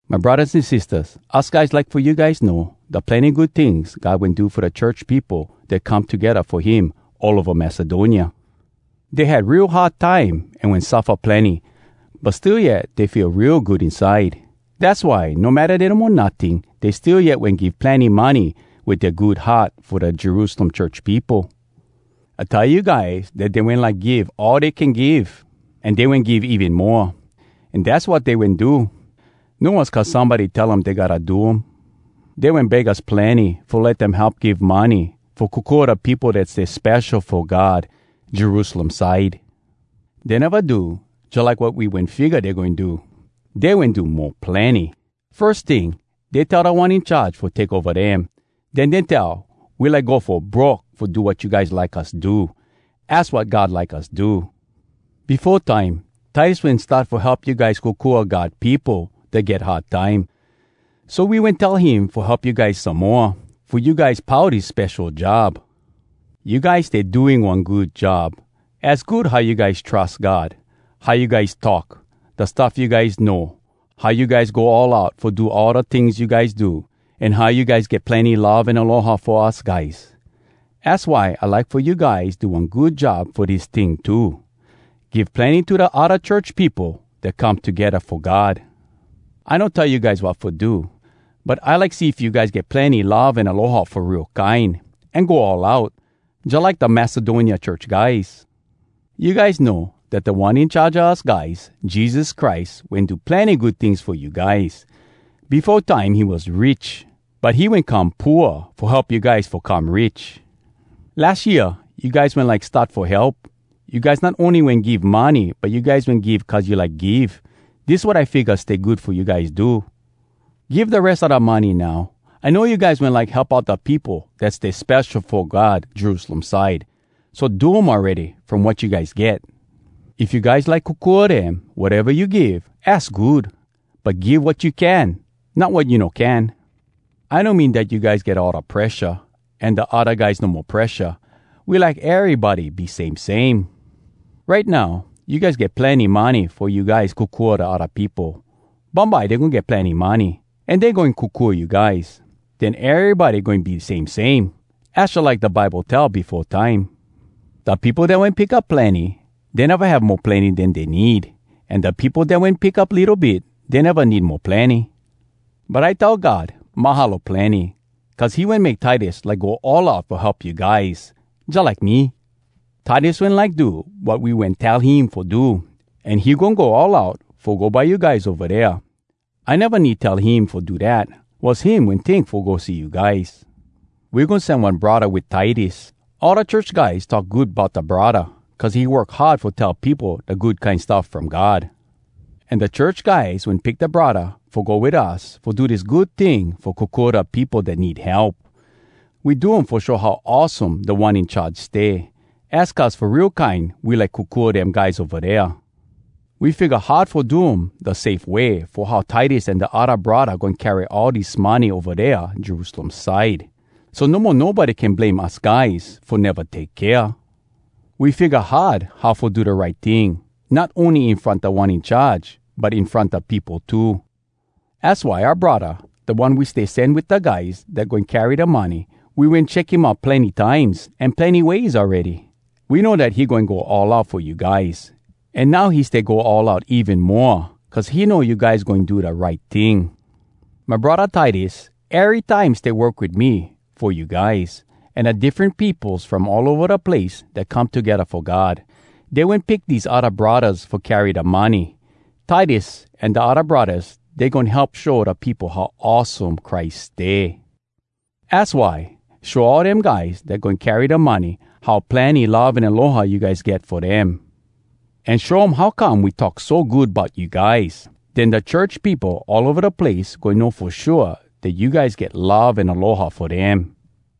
My braddahs an sistahs, us guys like fo you guys know da plenny good tings God wen do fo da church peopo dat come togedda fo him all ova Macedonia. Dey had real hard time an wen suffa plenny, but still yet dey feel real good inside. Dass why, no matta dey no mo notting, dey still yet wen give plenny money wit dea good heart fo da Jerusalem church peopo. I tell you guys dat dey wen like give all dey can give, an dey wen give even moa. An dass wat dey wen do. No was cuz somebody tell um dey gotta do um. Dey wen beg us plenny fo let dem help give money fo kokua da peopo dat stay spesho fo God, Jerusalem side. Dey neva do jalike wat we wen figga dey goin do—dey wen do mo plenny! Firs ting, dey tell Da One In Charge fo take ova dem. Den dey tell, “We like go fo broke fo do wat you guys like us do. Az wat God like us do.” Befo time, Titus wen start fo help you guys kokua God peopo dat get hard time. So we wen tell him fo help you guys some moa, fo you guys pau dis spesho job. You guys stay doing one good job. Az good how you guys trus God, how you guys talk, da stuff you guys know, how you guys go all out fo do all da tings you guys do, an how you guys get plenny love an aloha fo us guys. Az why I like fo you guys do one good job fo dis ting too: give plenny to da odda church peopo dat come togedda fo God. I no tell you guys wat fo do, but I like see if you guys get plenny love an aloha fo real kine, an go all out, jalike da Macedonia church guys. You guys know dat Da One In Charge a us guys, Jesus Christ, wen do plenny good tings fo you guys. Befo time he was rich, but he wen come pooa fo help you guys fo come rich. Las year you guys wen like start fo help. You guys not ony wen give money, but you guys wen give cuz you like give. Dis wat I figga stay good fo you guys do: Give da res a da money now. I know you guys wen like help out da peopo dat stay spesho fo God Jerusalem side. So do um awready, from wat you guys get. If you guys like kokua dem, wateva you give, az good. But give wat you can, not wat you no can. I no mean dat you guys get all da presha, an da odda guys no mo presha. We like erybody be same same. Right now you guys get plenny money fo you guys kokua da odda peopo. Bumbye dey goin get plenny money, an dey goin kokua you guys. Den erybody goin be same same. Az jalike da Bible tell befo time, “Da peopo dat wen pick up plenny, Dey neva have mo plenny den dey need. An da peopo dat wen pick up litto bit, Dey neva need mo plenny.” But I tell God “Mahalo plenny!” cuz he wen make Titus like go all out fo help you guys, jalike me. Titus wen like do wat we wen tell him fo do, an he goin go all out fo go by you guys ova dea. I neva need tell him fo do dat. Was him wen tink fo go see you guys. We goin sen one braddah wit Titus. All da church guys talk good bout da braddah cuz he work hard fo tell peopo da Good Kine Stuff From God. An da church guys wen pick da braddah fo go wit us fo do dis good ting fo kokua da peopo dat need help. We do um fo show how awesome Da One In Charge stay. Az cuz fo real kine we like kokua dem guys ova dea. We figga hard fo do um da safe way fo how Titus an da odda braddah goin carry all dis money ova dea Jerusalem side, so no mo nobody can blame us guys fo neva take kea. We figga hard how fo do da right ting, not ony in front Da One In Charge, but in front da peopo too. Az why oua braddah da one we stay send wit da guys dat goin carry da money, we wen check him out plenny times an plenny ways awready. We know dat he goin go all out fo you guys. An now he stay go all out even moa, cuz he know you guys goin do da right ting. My braddah Titus erytime stay work wit me fo you guys. An da diffren peopos from all ova da place dat come togedda fo God, dey wen pick dese odda braddahs fo carry da money. Titus an da odda braddahs, dey goin help show da peopo how awesome Christ stay. Az why, show all dem guys dat goin carry da money how plenny love an aloha you guys get fo dem. An show um how come we talk so good bout you guys. Den da church peopo all ova da place goin know fo shua dat you guys get love an aloha fo dem.